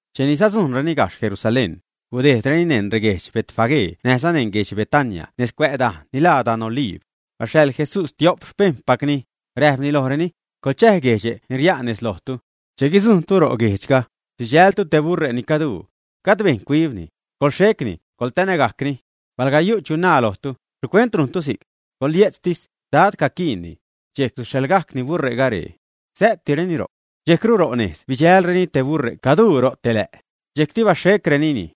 Cheni sadzujṉreni gajxh Jerusalén, gudejdreni neṉ reguedx Betfagé näjza neṉ guedx Betania nez cuä' dajne' ni laa dan Oliib. Baxhaḻ Jesús tiop xpejṉpacni, räjpni lojreni: ―Coḻchäj guedxe' ni ria'n nez lojtu. Che guidzujṉtu ro' guejdxga, sidxältu te buṟe' ni caduu. Gajd bejṉ cuibni. Coḻxhecni, coḻtanägajcni. Palga yu' chu naa lojtu: “¿Xhicuent rujntu si'c?” Coḻye'tztis: “Dad caquiinni.” Dxejc suxhaḻgajcni buṟe'ga ree. Säätireni ro'c. Dxejcru ronejz bidxälreni te buṟe' caduu ro' te lä'. Dxejcti baxhecrenini.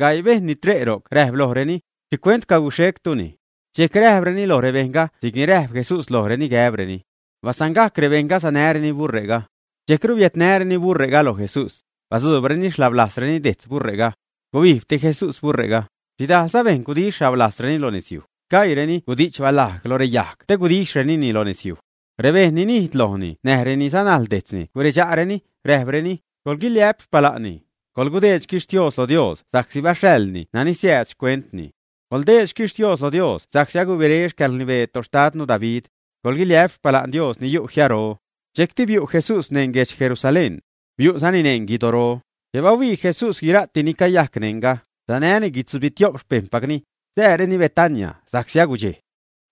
Gaii bejṉ ni tre' ro'c räjp lojreni: ―¿Xhicuent caguxhectuni? Dxejc räjpreni loj rebejṉga si'cni räjp Jesús lojreni gäbreni. Basangajc rebejṉga sanäreni buṟe'ga. Dxejcru biädnäreni buṟe'ga loj Jesús. Badzuubreni xhablajzreni dejtz buṟe'ga. Gubijbti Jesús buṟe'ga. Xhidajlza bejṉ gudixh xhablajzreni lo nezyuj, sgaiireni gudi'ch balajg lo reyajg te gudixhrenini lo nezyuj. Rebejṉ ni nijd lojni näj reni sanajl dejtzni guredxa'reni, räjpreni: ―¡Coḻguiliä'p xpala'nni! Coḻdeed xquixhtiooz loj Dios sa'csi baxhaḻni nani siääd xcuentni. Coḻdeed xquixhtiooz loj Dios sa'csi agubiré xcäḻrnibee toxtadnu David. ¡Coḻguiliä'p xpala'n Dios ni yu' jiaro! Dxejcti biu' Jesús neṉ guedx Jerusalén. Biu'zani neṉ guidoro. Che bahuii Jesús guira'ti ni cayajc neṉga, sanäni guitzubitio'p xpejṉpacni, sääreni Betania sa'csi agudxej.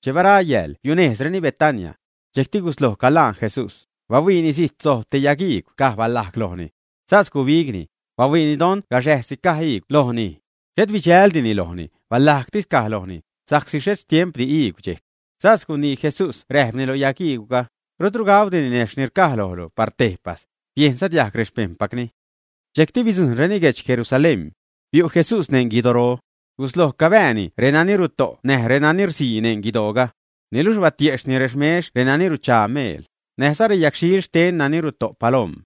Che bara yääl, biunejzreni Betania. Dxejcti gusloj calaan Jesús, bahuiini zijt sojb te yag iigw caj balajg lojni. Sas gubigni, bahuiini don gaxäjsi caj iigw lojni. Xhet bidxäldini lojni; balajgtis caj lojni, sa'csi xhet xtiempdi iigw dxejc. Sas gunii Jesús räjpni loj yag iigwga: ―Rutru gauudi ninejxh ni rcaj lojlu par tejpas. Biejnza diajg rexpejṉpacni. Dxejcti bidzujṉreni guedx Jerusalén. Biu' Jesús neṉ guidoro. Gusloj cabääni renani ruto' näj renani rsii neṉ guidooga. Niluxh batiejxhni rexmex renani ruchaa meel, näjza reyagxhil xten renani ruto' paloom.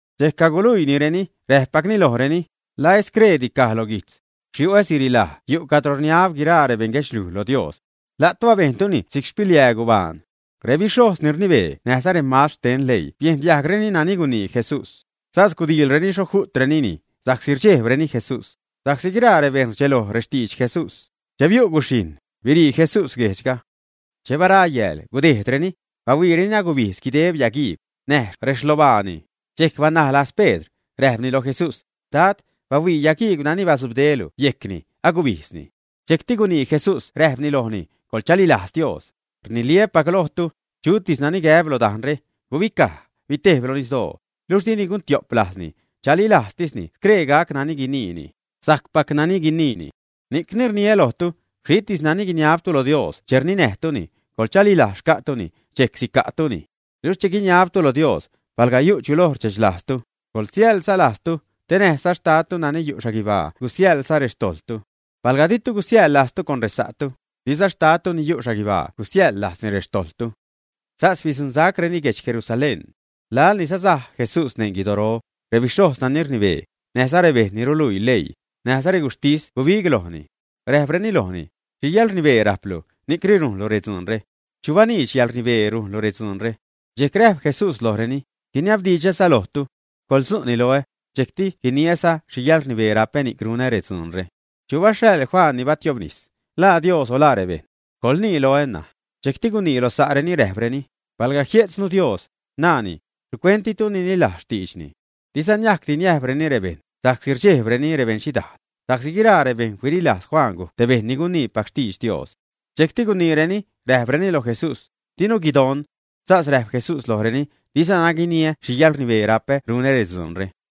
Dxejc caguluiinireni, räpgajcni lojreni: ―¿La et screedi caj loj guijtz? “Xyu'ä siriḻaj yu' cadro rninab guiraa rebeṉguedxliuj lo Dios.” La'tu abejntuni si'c xpiliää gubaan. Rebixhojz ni rnibee näjza remastr xten leii biejn diajgreni nani gunii Jesús. Sas gudiilreni xho ju'trenini, sa'csi rdxejbreni Jesús, sa'csi guiraa rebejṉ rdxeloj rextidx Jesús. Che biu' guxhijṉ, birii Jesús guejdxga. Che bara yääl gudejdreni, bahuiireni agubijdz guideb yagiigw, näj rexlobaani. Dxejc banaj lajz Pedr, räjpni loj Jesús: ―Dad, bahuii yagiigw nani batzubdelu yejcni, agubijdzni. Dxejcti gunii Jesús räjpni lojni: ―Coḻchalilajz Dios. Rniliä́pac lojtu, chutis nani gäb loj dajnre: “Gubicaj, bitejb loj nisdoo”, luxh dini guntio'p lajzni, chalilajztisni scree gac nani guniini, sajcpac nani guniini. Ni'cni rniä lojtu, xhitis nani guiniabtu lo Dios che rninäjtuni, coḻchalilajz xca'tuni, dxejc sica'tuni. Luxh che guiniabtu Dios, palga yu' chu loj rdxechlajztu, coḻsiäjlza lajztu, te näjza Xtadtu nani yu' xhaguibaa gusiäjḻza rextojḻtu. Palga ditu gusiäjḻ lajztu con resa'tu, diza Xtadtu nani yu' xhaguibaa gusiäjḻ lajzni rextojḻtu. Sas bidzuṉsacreni guedx Jerusalén. Laḻ ni sasaj Jesús neṉ guidoro, rebixhojz nani rnibee, näjza rebejṉ ni ruluii leii, näjza reguxhtis gubig lojni. Räjpreni lojni: ―¿Xhi yäḻrnibee rajplu, ni'c rujnlu redzuunre? ¿Chu baniidx yäḻrnibee rujnlu redzuunre? Dxejc räjp Jesús lojreni: ―Guiniabdidxäza lojtu. Coḻtzu'ni loä, dxejcti guiniäza xhi yäḻrnibeere rapä ni'c runä redzuunre. ¿Chu baxhaḻ Juan ni batiobnis? ¿La Dios o la rebejṉ? Coḻnii loä ṉaj. Dxejcti gunii loj sa'reni, räjpreni: ―Palga jie'tznu “Dios”, naani “¿xhicuent ditu nililajz xtiidxni?” Diza niacti niäjbreni “rebejṉ” sa'csi rdxejbreni rebeṉxhidaal, sa'csi guiraa rebejṉ huililajz Juan gujc te bejṉ ni guniipac xtidx Dios. Dxejcti guniireni, räjpreni loj Jesús: ―Dinu guidon. Sas räjp Jesús lojreni: ―Dizana guiniä xhi yäḻrnibeere rapä runä redzuunre.